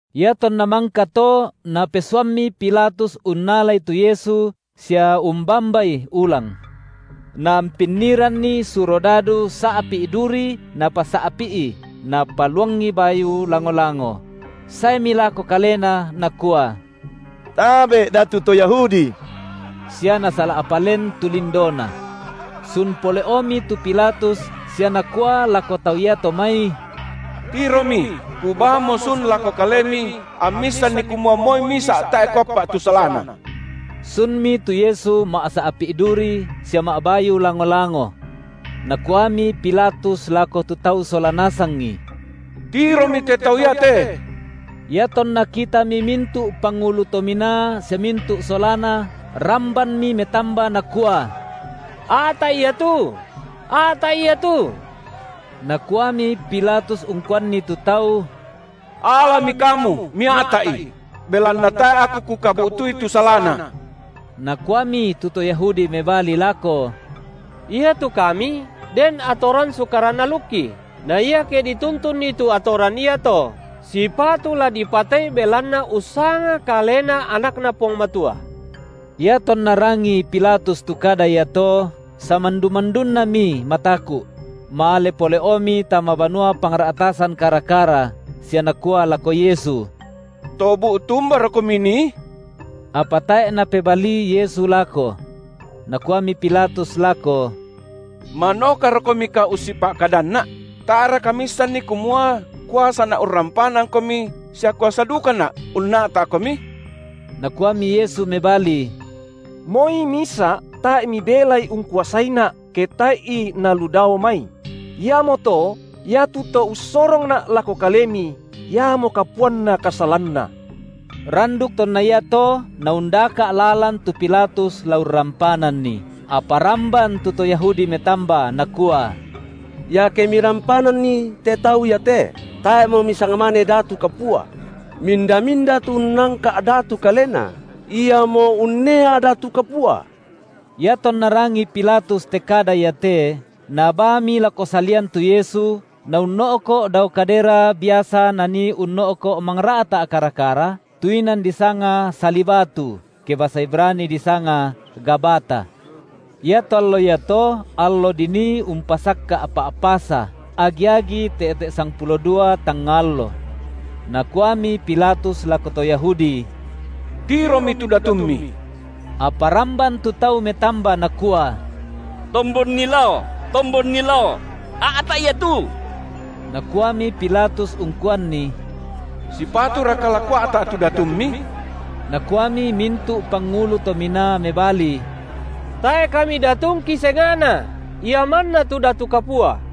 Iatonna mangkato napesuammi Pilatus unnalai tu Yesu, sia umbambaI ulang. Naampinniranni surodadu sa’pi’ duri napasa’pi’i, napaluangi bayu lango-lango; saemi lako Kalena nakua: Tabe’ Datu to Yahudi! sia nasala’pa len tu lindoNa. Sun pole’omi tu Pilatus sia nakua lako tau iato mai: Tiromi, kubaamo sun lako kalemi, ammi issanni kumua moi misa’ tae’ kuappa’ tu salaNa. Sunmi tu Yesu ma’sa’pi’ duri sia ma’bayu lango-lango. Nakuami Pilatus lako tu tau sola nasangi: Tiromi te tau iate! Iatonna kitami mintu’ pangulu to minaa sia mintu’ solana, rambanmi metamba nakua: A’ta’I Ia tu, a’ta’I Ia tu! Nakuami Pilatus ungkuanni tu tau: Alami kamu, mia’ta’I! Belanna tae’ aku kukabu’tui tu salaNa. Nakuami tu to Yahudi mebali lako: Iatu kami den atoran sukaran alukki, na iake dituntunni tu atoran iato sipatu la dipatei belanna ussanga Kalena AnakNa Puang Matua. Iatonna rangii Pilatus tu kada iato, samandu-mandunnami mataku’; male pole’omi tama banua pangra’tasan kara-kara, sia nakua lako Yesu: To bu’tu umbaroKomi nii? Apa tae’ Napebalii Yesu lako. Nakuami Pilatus lako: ManokaroKomika ussipa’kadanna’? Tae’raka Miissanni kumua kuasana’ urrampanangKomi sia kuasa dukana’ unna’ta’Komi? Nakuami Yesu mebali: Moi misa’ tae’ mibelai ungkuasaiNa’, ke tae’i nalu Dao mai; iamoto iatu to ussorongNa’ lako kalemi, iamo kapuanna kasalanna. Randuk tonna iato naundaka’ lalan tu Pilatus la urrampananNi, apa ramban tu to Yahudi metamba, nakua: Iake mirampananNi te Tau iate, tae’mo misisangmane datu kapua; minda-minda tu unnangka’ datu kalena, iamo unnea datu kapua. Iatonna rangii Pilatus te kada iate, nabaami lako salian tu Yesu, naunno’ko’ dao kadera biasa nanii unno’ko’ mangra’ta’ kara-kara, tu inan disanga Sali batu, ke basa Ibrani disanga Gabata. Iato allo iato allo dinii umpasakka’ Pa’pasa, agi-agi te’te’ sangpulo dua tangnga allo. Nakuami Pilatus lako to Yahudi: Tiromi tu datummi! Apa ramban tu tau metamba nakua: Tombonni lao, tombonni lao! a’ta’I Ia tu! Nakuami Pilatus ungkuanni: Sipaturaka la kua’ta’ tu datummi? Nakuami mintu’ pangulu to minaa mebali: Tae’ kami datungki senga’na, ia manna tu datu kapua.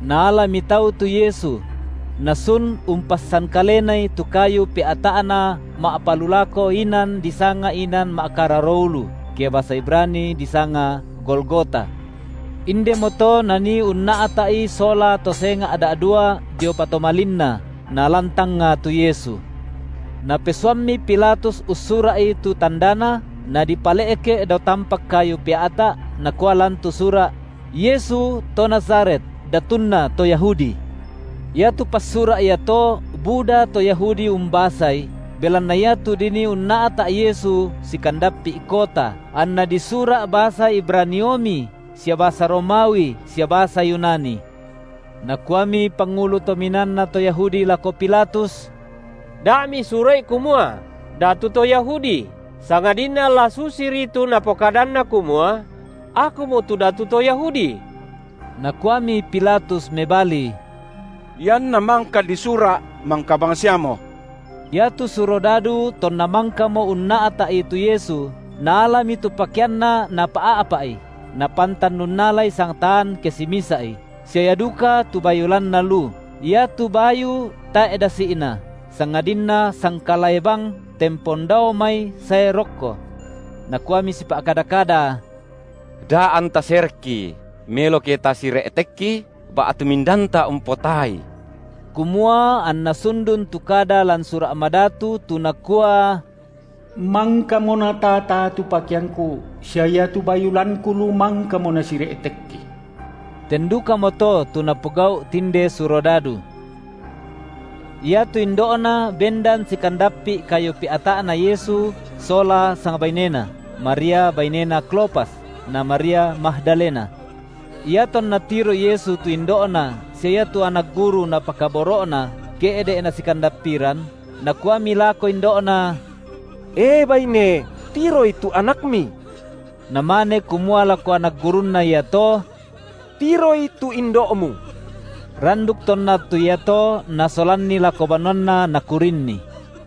Naalami tau tu Yesu; Nasun umpassan Kalenai tu kayu pea’ta’Na ma’palulako inan disanga Inan ma’kararo ulu, ke basa Ibrani disanga Golgota. Indemoto nanii unna’ta’I sola to senga’ da’dua dio patomalinNa, nalan tangnga tu Yesu. Napesuammi Pilatus ussura’i tu tandana, nadipale’ke’ dao tampak kayu pea’ta’, nakua lan tu sura’: Yesu, to Nazaret, Datunna to Yahudi. Iatu passura’ iato buda to Yahudi umbasai, belanna iatu dinii unna’ta’ Yesu sikandappi’ kota, anna disura’ basa Ibraniomi sia basa Romawi sia basa Yunani. Nakuami pangulu to minaanna to Yahudi lako Pilatus: Da misura’i kumua: Datu to Yahudi, sangadinna la susiri tu Napokadanna kumua: Akumo tu Datu to Yahudi. Nakuami Pilatus mebali: Ianna mangka disura’, mangka bangsiamo! Iatu surodadu tonna mangkamo unna’ta’I tu Yesu, naalami tu pakeanNa napa’a’pa’i, napantan unnalai sangtaan ke misa’i, sia ia duka tu bayu lanna lu; iatu bayu tae’ dasi’na, sangadinna sangkalae bang tempon dao mai sae rokko. Nakuami sipa’kada-kada: Da anta serekki, melo ke tasire’tekki, ba’tu mindanta umpotaai, kumua anna sundun tu kada lan Sura’ Madatu tu nakua: Mangkamo nataa-taa tu pakeangKu sia iatu bayu lanKu lu mangkamo nasire’tekki. Ten dukamoto tu napogau’ tinde surodadu. Iatu indo’Na bendan sikandappi’ kayu pea’ta’na Yesu sola sangbainena, Maria bainena Klopas, na Maria Magdalena. Iatonna tiroi Yesu tu indo’Na sia iatu anak guru Napakaboro’na, ke’de’ nasikandappiran, Nakuami lako indo’Na: E baine, tiroi tu anakmi! Namane kumua lako anak gurunNa iato: Tiroi tu indo’mu! Randuk tonna attu iato nasolanni lako banuanna nakurinni.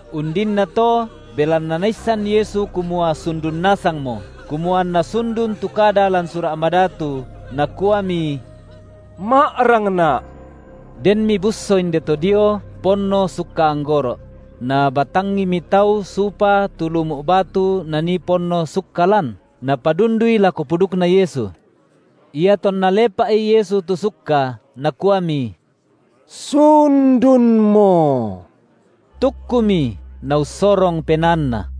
Undinnato, belanna Naissan Yesu kumua sundun nasangmo, kumua anna sundun tu kada lan Sura’ Madatu, Nakuami: Ma’rangNa’. Denmi busso inde to dio ponno sukka anggoro’; nabatangimi tau supa tu lumu’ batu nanii ponno sukka lan, napadundui lako pudukNa Yesu. IatonNa lepa’i Yesu tu sukka, Nakuami: Sundunmo! Tukkumi, Naussorong penaanNa.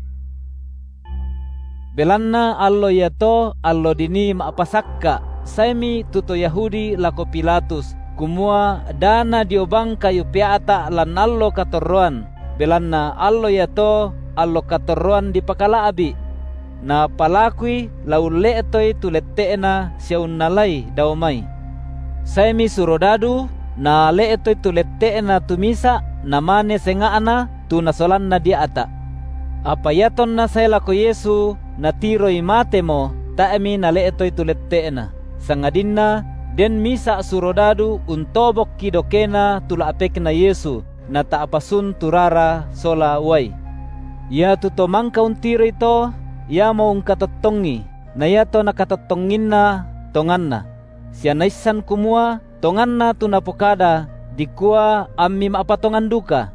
Belanna allo iato allo dinii ma’pasakka’, saemi tu to Yahudi lako Pilatus, kumua da nadio bang kayu pea’ta’ lan allo katorroan, belanna allo iato allo katorroan dipakala’bi’. Napalakui la ulle’toi tu lette’na sia unnalai dao mai. Saemi surodadu, nale’toi tu lette’na tu misa’ namane senga’na tu Nasolanna dia’ta’. Apa iatonna sae lako Yesu, natiroi matemo, tae’mi nale’toi tu lette’Na, sangadinna den misa’ surodadu untobokki dokena tu la’pekNa Yesu, nata’pa sun tu rara sola uai. Iatu to mangka untiroi to, iamo ungkatottongi, na iato nakatottonginna tonganna; sia naissan kumua tonganna tu napokada, dikua ammi ma’patongan duka.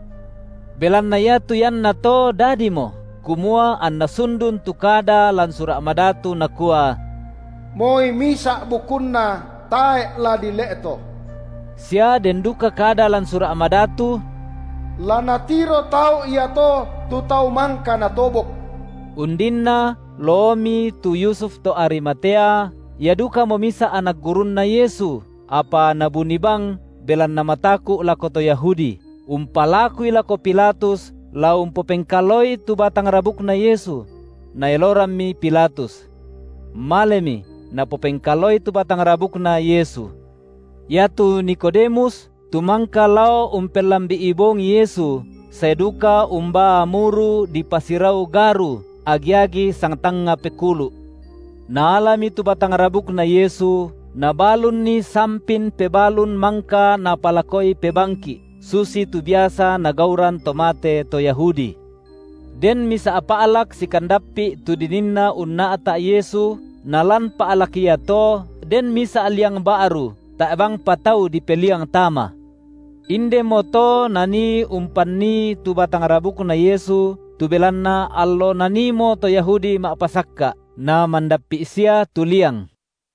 Belanna iatu iannato dadimo, kumua anna sundun tu kada lan Sura’ Madatu nakua: Moi misa’ bukunNa tae’ la dile’to. Sia den duka kada lan Sura’ Madatu: La natiro tau iato tu Tau mangka natobok. Undinna loomi tu Yusuf to Arimatea, ia dukamo misa’ anak gurunna Yesu, apa nabuni bang belanna mataku’ lako to Yahudi, umpalakui lako Pilatus la umpopengkalaoi tu batang rabukNa Yesu; naelorammi Pilatus. Malemi, napopengkalaoi tu batang rabukNa Yesu. Iatu Nikodemus, tu mangka lao umpellambi’i bongi Yesu, sae duka umbaa muru dipasirau garu, agi-agi sangtangnga pekulu’. Naalami tu batang rabukNa Yesu, nabalunni sampin pebalun mangka napalakoi pebangki’, susitu biasa nagauran to mate to Yahudi. Den misa’ pa’lak sikandappi’ tu dininna unna’ta’ Yesu, nalan pa’lak iato den misa’ liang ba’ru, tae’ bangpa tau dipeliang tama. Indemo to nanii umpannii tu batang rabukNa Yesu tu belanna allo naniimo to Yahudi ma’pasakka’, namandappi’ sia tu liang.